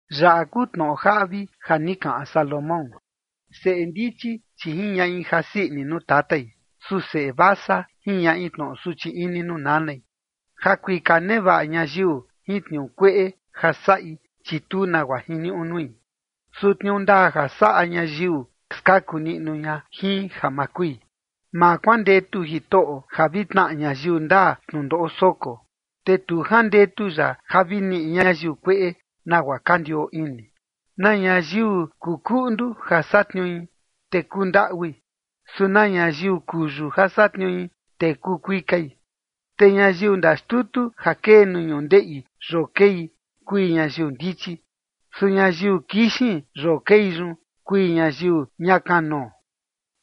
Yaꞌa kuu tnoꞌo jaꞌvi ja ni kaꞌan Salomón: Seꞌe ndichi, chi jiñaꞌi jasii ini nuu tatai, su seꞌe vasa jiñaꞌi tnoꞌo suchi ini nuu nanai. Ja kuika nevaꞌa ñayiu jin tniuu kueꞌe ja saꞌi, chi tu nagua jiniuꞌu nui. Su tniuu ndaa ja saꞌa ñayiu, skaku niꞌnu ña jin ja ma kui. Ma kuandetu Jitoꞌo ja vi tnaꞌa ñayiu ndaa tnundoꞌo soko, te tu jandetu ya ja vi niꞌi ñayiu kueꞌe nagua ka ndioo ini. Na ñayiu kuu kuꞌndu ja satniui, te kuu ndaꞌui. Su na ñayiu kuyu ja satniui, te kuu kuikai. Te ñayiu ndaxtutu ja kee nuu ñundeꞌi yoo kei, kui ñayiu ndichi. Su ñayiu kixin yoo kei yun, kui ñayiu ña kanoo.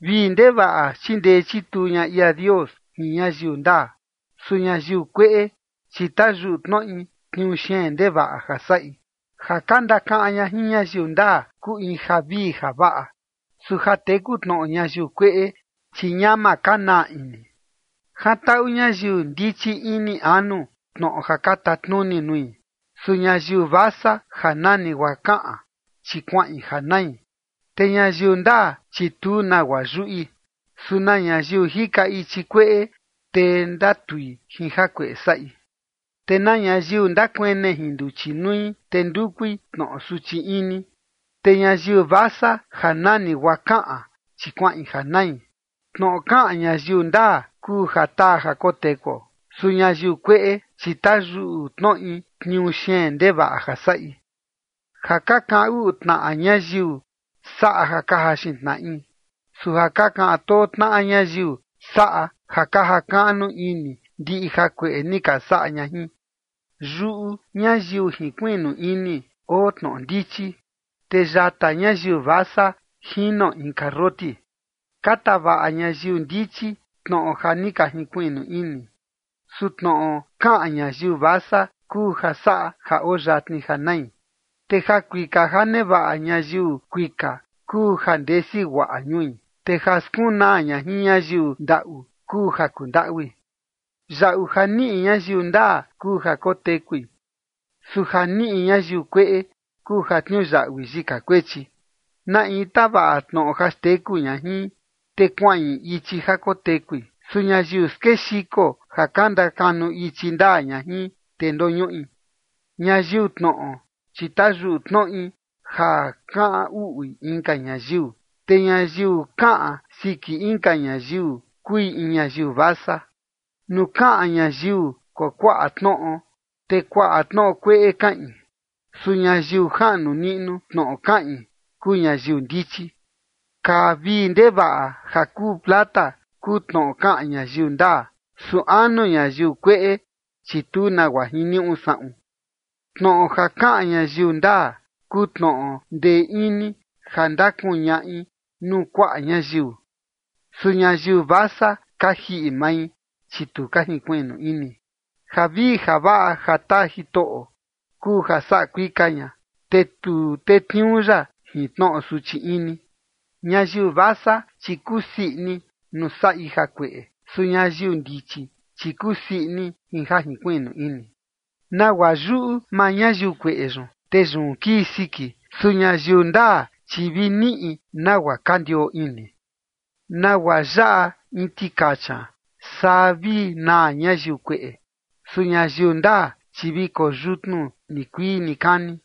Vii ndevaꞌa chindee chituu ña ia Dios jin ñayiu ndaa. Su ñayiu kueꞌe, chi tayuꞌu tnoꞌi tniuu xeen ndevaꞌa ja saꞌi. Ja ka ndakaꞌan ña jin ñayiu ndaa kuu in javii javaꞌa. Su ja teku tnoꞌo ñayiu kueꞌe, chi ñama ka naa ini. Jantaꞌu ñayiu ndichi ini anu tnoꞌo ja ka tatnuni nui. Su ñayiu vasa ja nani guaa kaꞌan, chi kuaꞌin ja nai. Te ñayiu ndaa, chi tu nagua yuꞌi. Su na ñayiu jika ichi kueꞌe, te ndatui jin jakueꞌe saꞌi. Te na ñayiu ndakuene jin nduchi nui, te ndukui tnoꞌo suchi ini. Te ñayiu vasa ja nani guaa kaꞌan, chi kuaꞌin ja nai. Tnoꞌo kaꞌan ñayiu ndaa kuu ja taa ja kotekuo. Su ñayiu kueꞌe, chi tayuꞌu tnoꞌi tniuu xeen ndevaꞌa ja saꞌi. Ja ka kaꞌan uꞌu tnaꞌa ñayiu saꞌa ja ka jaxin tnaꞌi. Su ja ka kaꞌan too tnaꞌa ñayiu saꞌa ja ka jakaꞌnu ini ndiꞌi jakueꞌe ni ka saꞌa ña jin. Yuꞌu ñayiu jinkuiꞌnu ini oo tnoꞌo ndichi. Te yata ñayiu vasa jino in karroti. Ka tavaꞌa ñayiu ndichi tnoꞌo ja ni ka jinkuiꞌnu ini. Su tnoꞌo kaꞌan ñayiu vasa kuu ja saꞌa ja oo yatni ja nai. Te jakuika ja nevaꞌa ñayiu kuika kuu ja ndesi guaꞌa ñui. Te ja skunaa ña jin ñayiu ndaꞌu kuu ja kundaꞌui. Yaꞌu ja niꞌi ñayiu ndaa kuu ja kotekui. Su ja niꞌi ñayiu kueꞌe kuu ja tniuyaꞌui yika kuechi. Na in tavaꞌa tnoꞌo ja xteku ña jin, te kuaꞌin ichi ja kotekui. Su ñayiu skexiko ja ka ndakanu ichi ndaa ña jin, te ndoñuꞌi. Ñayiu tnoꞌo, chi tayuꞌu tnoꞌi ja kaꞌan uꞌui inka ñayiu. Te ñayiu kaꞌan siki inka ñayiu kui in ñayiu vasa. Nuu kaꞌan ñayiu kuakuaꞌa tnoꞌo, te kuaꞌa tnoꞌo kueꞌe kaꞌin. Su ñayiu jaꞌnu niꞌnu tnoꞌo kaꞌin kuu ñayiu ndichi. Kaa vii ndevaꞌa ja kuu plata kuu tnoꞌo kaꞌan ñayiu ndaa. Su anu ñayiu kueꞌe, chi tu nagua jiniuꞌu saꞌun. Tnoꞌo ja kaꞌan ñayiu ndaa kuu tnoꞌo ndee ini ja ndakuñaꞌi nuu kuaꞌa ñayiu. Su ñayiu vasa ka jiꞌi mai, chi tu ka jinkuiꞌnu ini. Javii javaꞌa ja taa Jitoꞌo kuu ja saꞌa kuika ña, te tu tetniuu ya jin tnoꞌo suchi ini. Ñayiu vasa, chi kusii ini nuu saꞌi jakueꞌe. Su ñayiu ndichi, chi kusii ini jin ja jinkuiꞌnu ini. Nagua yuꞌu maa ñayiu kueꞌe yun, te yun kii siki. Su ñayiu ndaa, chi vi niꞌi nagua ka ndioo ini. Nagua yaꞌa in tikacha, saa vi naa ñayiu kueꞌe. Su ñayiu ndaa, chi vi koyutnu nikuii nikani.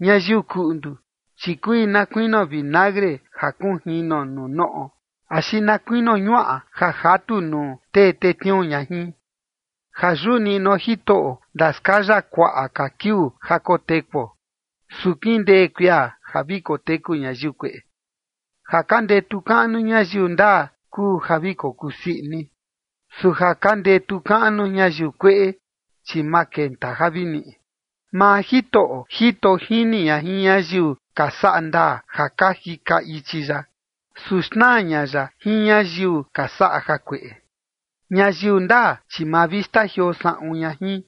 Ñayiu kuꞌndu, chi kui na kuinio vinagre ja kunjino nuu noꞌo axi na kuinio ñuaꞌa ja jatu nuu tee tetniuu ña jin. Ja yuꞌu niꞌnuo Jitoꞌo ndaskaya kuaꞌa ka kiuu ja kotekuo. Su kindee kuia ja vi koteku ñayiu kueꞌe. Ja ka ndetu kaꞌnu ñayiu ndaa kuu ja vi kokuu sii ini. Su ja ka ndetu kaꞌnu ñayiu kueꞌe, chi ma kenta ja vi niꞌi. Maa Jitoꞌo jito jini ña jin ñayiu ka saꞌa ndaa ja ka jika ichi ya. Su xnaa ña ya jin ñayiu ka saꞌa jakueꞌe. Ñayiu ndaa, chi ma vi xtajioo saꞌun ña jin.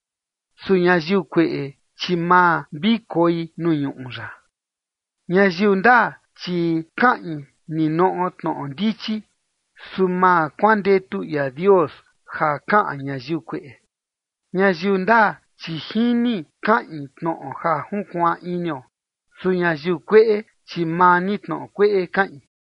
Su ñayiu kueꞌe, chi ma vi koi nuu ñuꞌu ya. Ñayiu ndaa, chi kaꞌin ninoꞌo tnoꞌo ndichi. Su ma kuandetu ia Dios ja kaꞌan ñayiu kueꞌe. Ñayiu ndaa, chi jini kaꞌin tnoꞌo ja junkuaan inio. Su ñayiu kueꞌe, chi maa ni tnoꞌo kueꞌe kaꞌin.